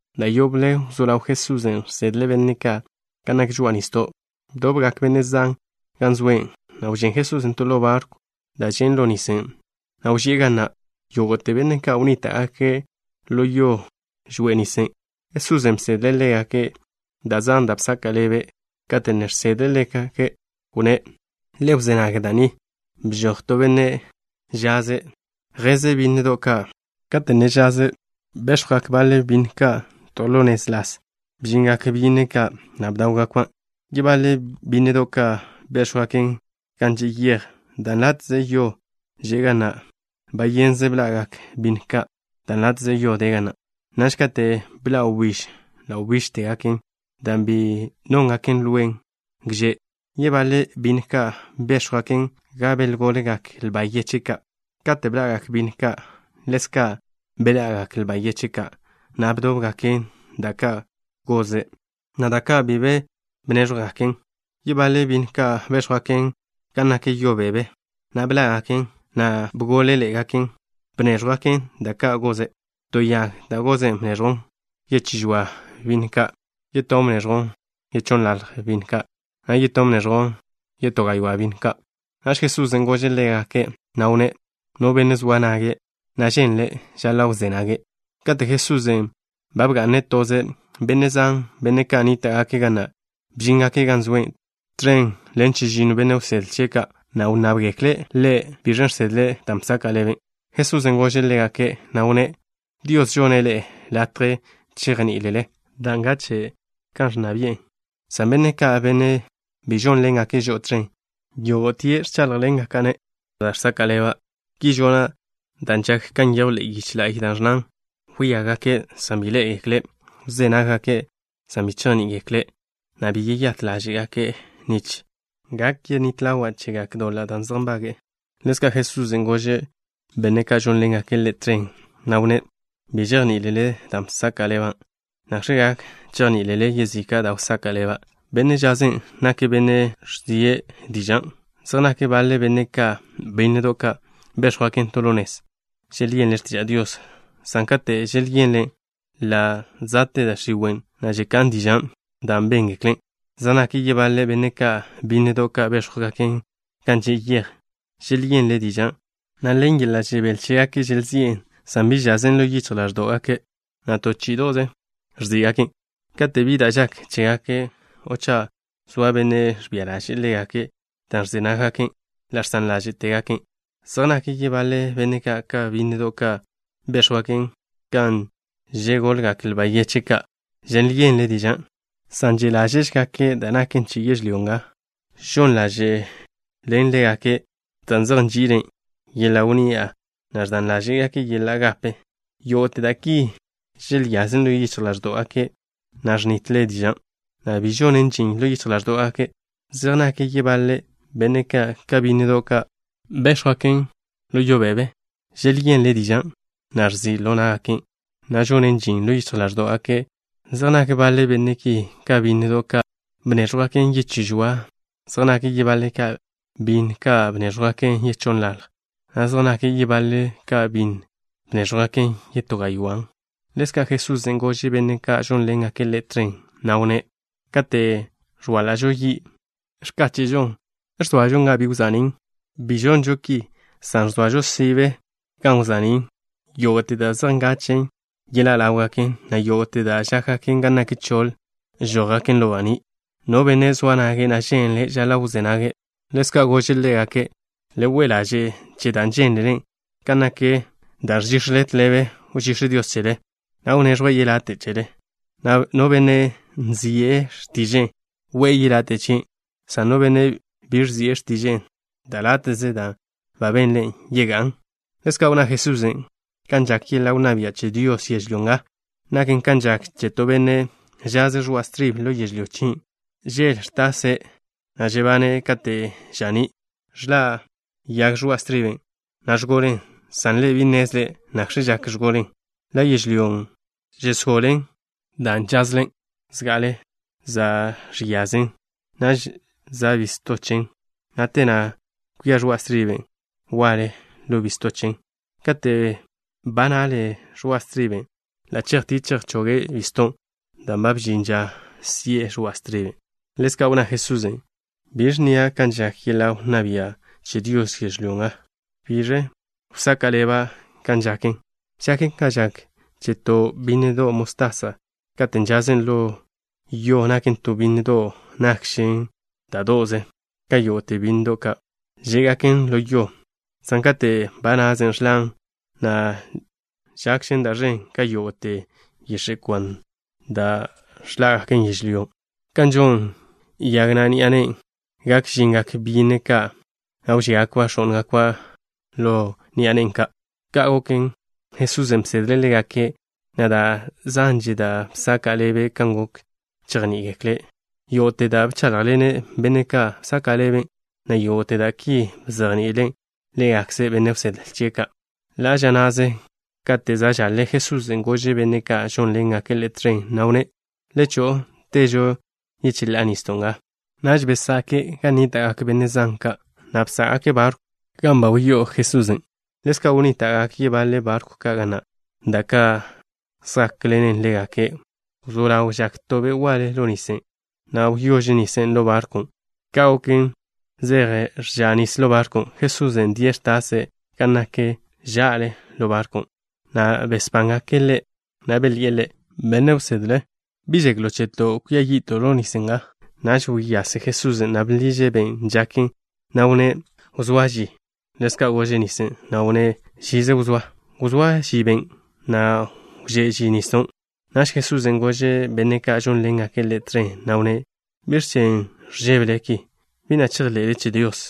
Da' yoble wzó ḻaw Jesusen' žsedle' benne' ka' gan nak žoa'a nisdo'. Bdobgak benne' zan gan zoe', na' wžén Jesusen' to ḻo barkw da' žen' ḻo nisen', na' wži'e ga na', na' yógo'te benne' ka' wnníta'gake' ḻo yo žoa'a nisen'. Jesusen' bsedle' ḻégake' da' zan, da' bsaka' ḻebe'. Kate' ne žsedle' ḻégake', wnné': —Le wzé nag da' ni. Bžoj to benne' žaz, zjeze' bínnedo' ka'. Kate' ne zjeze', béx̱jwgak baḻe bínnedo' ka' to ḻo nez las. Bžingak byínnedo' ka', na' bdáwgakban'. Yebaḻe bínnedo' ka' béx̱jwgaken gan že' yej, gan de láte'ze yo. Bayenze bḻa'gak bínnedo' ka' dan' de láte'ze yo ga na'. Naž kate' bḻa' wbíž, ḻa' wbížtegaken dan' bi nóngaken lwen gže'. Yebaḻe bínnedo' ka' béx̱jwgaken gan begolgak lba yeche' ka'. Kate' bḻa'gak bínnedo' ka', ḻezka' beḻa'gak lba yeche' ka', na' bdóbgaken da' ka' goze', na' da' ka' bi be bnéẕjwgaken. Yebaḻe bínnedo' ka' béx̱jwgaken gan nak yo bebe, na' bḻá'gaken, na' gól-ḻe'egaken. Bnéẕjwḻe'egak da' ka' goze'. To yag da' goze' bneẕjwn yechí žoa bínnedo' ka'. Yetón bneẕjwn yechonnḻalj bínnedo' ka', na' yetón bneẕjwn yetó gaywá' bínnedo' ka'. Naž Jesusen' gože' ḻégake', na' wnné': —No benne' zoa nage', na' ženle', žaḻa' wzé nage'. Kate' Jesusen' ba bga'ne' toze', benne' zan, benne' ka' nníta'gake' ga na' bžíngake' gan zoe', tẕen ḻen chežinno benne' wsedle chie' ka', na' wnnábgekle' Ḻe' biẕ žsedle dan' bsaka' ḻebe'. Jesusen' gože' ḻégake', na' wnné': —Dios žonne' ḻe'e latje chejní'ilele da' ngache' kan ẕnna bi'e, san benne' ka', benne' bi žónḻengake' žo'o tẕen, yógo'te ẕcháḻjḻengaka'-ne' da' žsaka' ḻeba'. Ki žona' dan' žak kan nyejw ḻe'e yiche la'y, da' ẕnnan: Wíagake', san bi ḻé'egekle'. Wzé nággake', san bi chejní'igekle', na' bi yeyát ḻáže'gake' nich gak yenít ḻawa' chégake' doḻa' da' zej nbage'e. Ḻezka' Jesusen' gože' benne' ka' žónḻengake' Ḻe' tẕen, na' wnné': —¿Bi žejní'ilele dan' bsaka' ḻeba'? ¿Nakx̱ gak chejní'ilele yezika' da' wsaka' ḻeba'? Benne' žazen' nake' benne' ẕzie' diža'. Zej nak baḻe benne' ka' ka bínnedo' ka' béx̱jwgaken to ḻo nez. Želyenle' x̱tiža' Dios, san kate' želyenlen', ḻa' za'te da' x̱iwe', na' ẕka'n dižan' da' béngekle'. Zej nak yebaḻe benne' ka' ka bínnedo' ka' béx̱jwgaken gan že' yej. Želyenle' dižan', na' ḻen yeḻa' žebél chégake' želzi'en. San bi žazen ḻo yichj ḻáẕdo'gake', na' to chí'ido'ze ẕzí'gaken'. Kate' bi da' žak chégake' o cha' zoa benne' ẕbia ḻaže'e ḻégake' dan' ẕze nággaken', ḻa' žsan ḻáže'tegaken'. Zej nak yebaḻe benne' ka' ka bínnedo' ka' béx̱jwgaken gan žegolgak lba yeche' ka'. Želyenle' dižan', san že' ḻáže'gake' da' naken che yežlyó nga. Žon ḻáže'len ḻégake' dan' zej nži'ile' yeḻa' wnni'a, na' ẕdan ḻáže'gake' yeḻa' gape. Yógo'te da' ki želyazen ḻo yichj ḻáẕdo'gake', na' ẕnitle dižan', na' bi žonen žin ḻo yichj ḻáẕdo'gake'. Zej nak yebaḻe benne' ka' ka bínnedo' ka' béx̱jwgaken ḻo yo bebe. Želyenle' dižan', na' ẕzi' ḻo ná'gaken', na' žonen žin ḻo yichj ḻáẕdo'gake'. Zej nak baḻe benne' ki ka bínnedo' ka' bnéẕjwgaken yechí žoan. Zej nake' yebaḻe' ka bínnedo' ka' bnéẕjwgaken yechónnḻaljen, na' zej nak yebaḻe' ka bínnedo' ka' bnéẕjwgaken yetó gaywán'. Ḻezka' Jesusen' gože' benne' ka' žónḻengake' Ḻe' tẕen, na' wnné': —Kate' ẕwáḻa'žo yi', ¿ẕdóse'žon to kak, o ẕgo'ožon ẕane gan žáta'žo? Bi žonžo ki, san ẕzoažon ža'le gan ko'on baní'. Yógo'te da' zej ngachen' yeḻá' ḻáwgaken, na' yógo'te da' žákgaken gan nak choḻ žójgaken ḻo baní'. No benne' zoa nage', na' ženle', žaḻa' wzé nage'. Ḻezka' gože' ḻégake': —Le we' ḻaže' che da' žénlele. Kan nak da' ẕžíx̱ele, tḻebe wžíx̱ Dios chele, na' wneẕjwe' yelate' chele. No benne' nzi'e x̱tiže'e, we'e yelate' chie', san no benne' bi nzi'e x̱tiže'e, da' láte'do'ze da' benle', yegá'n. Ḻezka' wnná Jesusen': —Kan žak yeḻa' wnná bia' che Dios yežlyó nga naken kan žak kate' to benne' žaze' ẕoa' stribe ḻo yežlyó chie'. Yele ẕtase', na' žeyase' kate' za' ža'ní'. Ẕḻa' yag ẕoa' striben', na' ẕgolen, san ḻe' bi nnezle' nakx̱ žak ẕgolen. Ḻa' yežlyón' žẕenen da' nazen ḻo yežlyón'. Zga'ale za' x̱yazen, naž za' bisto chen, na' te na' kwia ẕoa' stribe waḻe ḻo bisto chen. Kate' ba naḻe ẕoa' striben', ḻa' chejtie' chejchoge' bizton' dan' ba bžin ža si'e ẕoa' striben'. Ḻezka' wnná Jesusen': —¿Biẕ nnia' kan žak yeḻa' wnná bia' che Dios yežlyó nga? ¿Biẕ wsaka' ḻeba' kan žaken? Žaken kan žak che to bínnedo' mostasa. Kate' žazen ḻo yo naken to bínnedo' da' nakžen kwíde'do' ka yógo'te bínnedo' ka' žé'gaken ḻo yo, san kate' ba nazen, ẕḻan', na' žẕéntežen ka yógo'te yix̱e' kwan da' žé'gaken yežlyó. Kan žon yana' ni'a nen', gak žingak byínnedo' ka', na' wžíagakba' x̱ó'ngakba' ḻo ẕoḻ chen. Ka' goken, Jesusen' bsedle' ḻégake', na' da' zanže da' bsaka' ḻebe' kan gok chejní'igekle'. Yógo'te da' bcháḻjḻene' benne' ka', bzaka' ḻeben', na' yógo'te da' ki bzejni'ile' ḻégakze benne' wsedle chie' ka'. Ḻa' ža na'ze, kate' za' žaḻe, Jesusen' gože' benne' ka' žónḻengake' Ḻe' tẕen, na' wnné': —Le cho'o, težo yecheḻá'a nisdo' nga. Naž bkwásgake' gan nníta'gak benne' zan ka', na' bsá'gake' barkwn' gan ba že' Jesusen'. Ḻezka' wnníta'gak yebaḻe barkw ka' ga na', da' ka' zjákḻenen ḻégake'. Wzó ḻaw žak to be' waḻe ḻo nisen', na' wdá'a nis ḻo barkwn'. Ka' goken, zej ẕcha' nis ḻo barkwn'. Jesusen' die' ẕtase' ḻo x̱kogwe' gan nak ža'le ḻo barkwn', na' besbángake' Ḻe', na' belyi'e Ḻe': —Benne' wsedle. ¿Bi žeklo' cheto'? Gatkzto' ẕan nis nga. Naž wyase Jesusen', na' bḻiže' ben' žaken, na' wnné': —Wzóa ži. Ḻezka' gože' nisen', na' wnné': —Žize wzóa. Wzóa ži ben' goken, na' wžé' ži nisdon'. Naž Jesusen' gože' benne' ka' žónḻengake' Ḻe' tẕen, na' wnné': —¿Biẕ chen' ẕžébele ki? ¿Bi na' chejḻe'le che Dios?